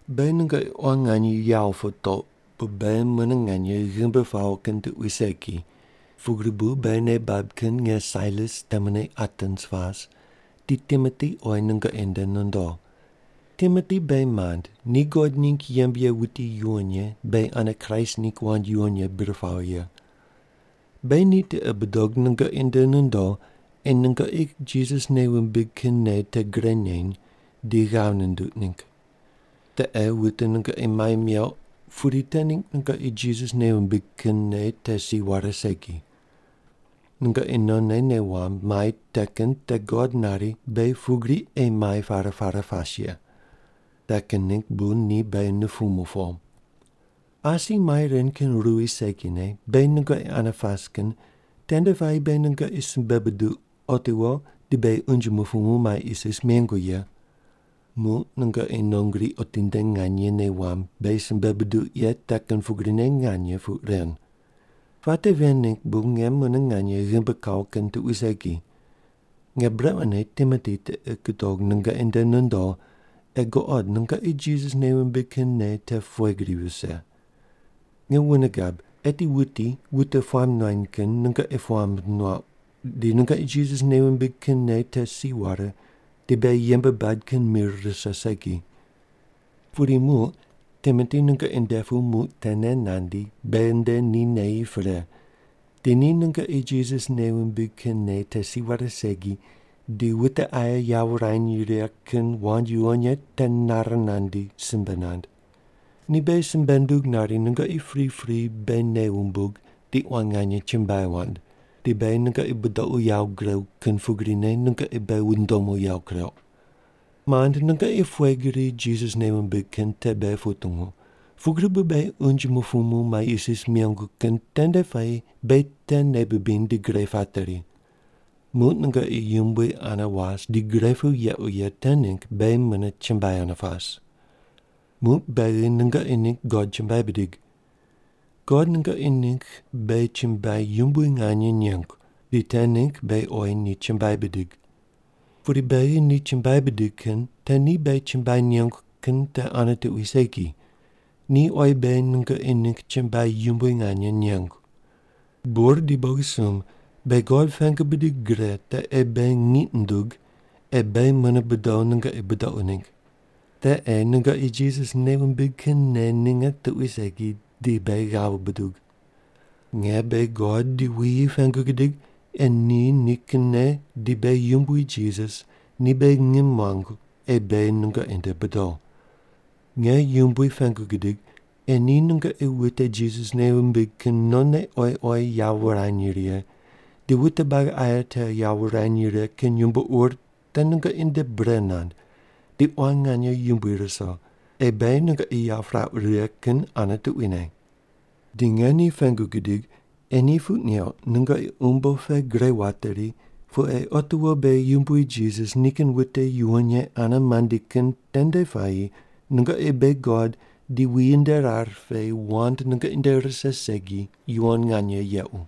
Beghi nungoqi quan nganye yawo putouq bu beghi mune nganye ghimbi pawo kin tuqui segi, pugri bu beghi nei bab kin nge Sailas temune Atens pas, di Timoti oyi nungoqi nde nondo. Timoti beghi mand, ni God ningg yembe ye wuti yuwon ye beghi ane Kraist ningg wand yuwon ye bir pawo ye. Beghi ni tiqi budog nungoqi nde nondo ei nungoqi Jisas nei wumbig kin nei te gre neny di ghav nunduq ningg. Te ei wute nungoqi mai meuq pudi te ningg nungoqi Jisas nei wumbig kin nei te si ware segi. Nungoqi nonne nei wamb mai te kin te God nari beghi pugri ei mai pare pare pas ye. Te kin ningg bu ni beghi nupumu po. Asi mai ren kin ruwi segine beghi nungoqi ane pas kin tende puayi beghi nungoqi simbe buduq otiwo di beghi unje mupumu mai isis mengu ye. Muq nungoqi non gri otinde nganye nei wamb beghi simbe buduq ye te kin pugrine nganye puq ren. Puate ven ningg bu nge mune nganye ghimbi kawo kin tuqui segi. Nge brequne Timoti tiqi gudog nungoqi nde nondo ei guqod nungoqi Jisas nei wumbig kin nei te pughe gri vise. Nge wune gab eti wuti wute puamb nuany kin nungoqi puamb nuauq di nungoqi Jisas nei wumbig kin nei te si ware di beghi yembe bad kin mir rise segi. Pudi muq Timoti nungoqi nde pu muq tene nandi beghi nde ni neyi pre, di ni nungoqi Jisas nei wumbig kin nei te si ware segi di wute aye yawo wurany righe kin wand yuwon ye te nare nandi simbe nand. Ni beghi simbe nundug nari nungoqi pripri beghi nei wumbug di quan nganye chumbuai wand, di beghi nungoqi budoqu yawo guregu kin pugrine nungoqi beghi wundomu yawo kureuq. Mand, nungoqi pughe gri Jisas nei wumbig kin te beghi putungu, pugri bu beghi unje mupumu mai isis mengu kin tende puayi beghi te nei bibiny di gre pateri. Muq nungoqi Yumbui ane was di gre pu yequ ye te ningg beghi mune chumbuai ane pas. Muq beghi nungoqi ningg God chumbuai bidig. God nungoqi ningg beghi chumbuai yumbui nganye nengu, di te ningg beghi oyi ni chumbuai bidig. Pudi beghi ni chumbuai bidig kin te ni beghi chumbuai nengu kin te ane tuqui segi, ni oyi beghi nungoqi ningg chumbuai yumbui nganye nengu. Bur di bogisumb beghi God pengu bidig gre te ei beghi ngiq nundug ei beghi mune bodo nungoqi budoqu ningg. Te ei nungoqi Jisas nei wumbig kin nei ninge tuqui segi di beghi ghav buduq. Nge beghi God di wuyi pengu gidig ei ni nikinne di beghi Yumbui Jisas ni beghi ngim muangu ei beghi nungoqi nde bodo. Nge Yumbui pengu gidig ei ni nungoqi wute Jisas nei wumbig kin nonne oyi oyi yawo wurany righe di wute buagi aye te yawo wurany righe kin yumbo ur te nungoqi nde bre nand di quan nganye yumbui ruso ei beghi nungoqi yawo pirauq righe kin ane tuquine. Di nge ni pengu gidig ei ni puq neuq nungoqi umbo pe gre wateri pu ei otiwo beghi Yumbui Jisas nikin wute yuwon ye ane mandi kin tende puayi nungoqi beghi God di wuyi nde rar pe wand nungoqi nde rise segi yuwon nganye yequ.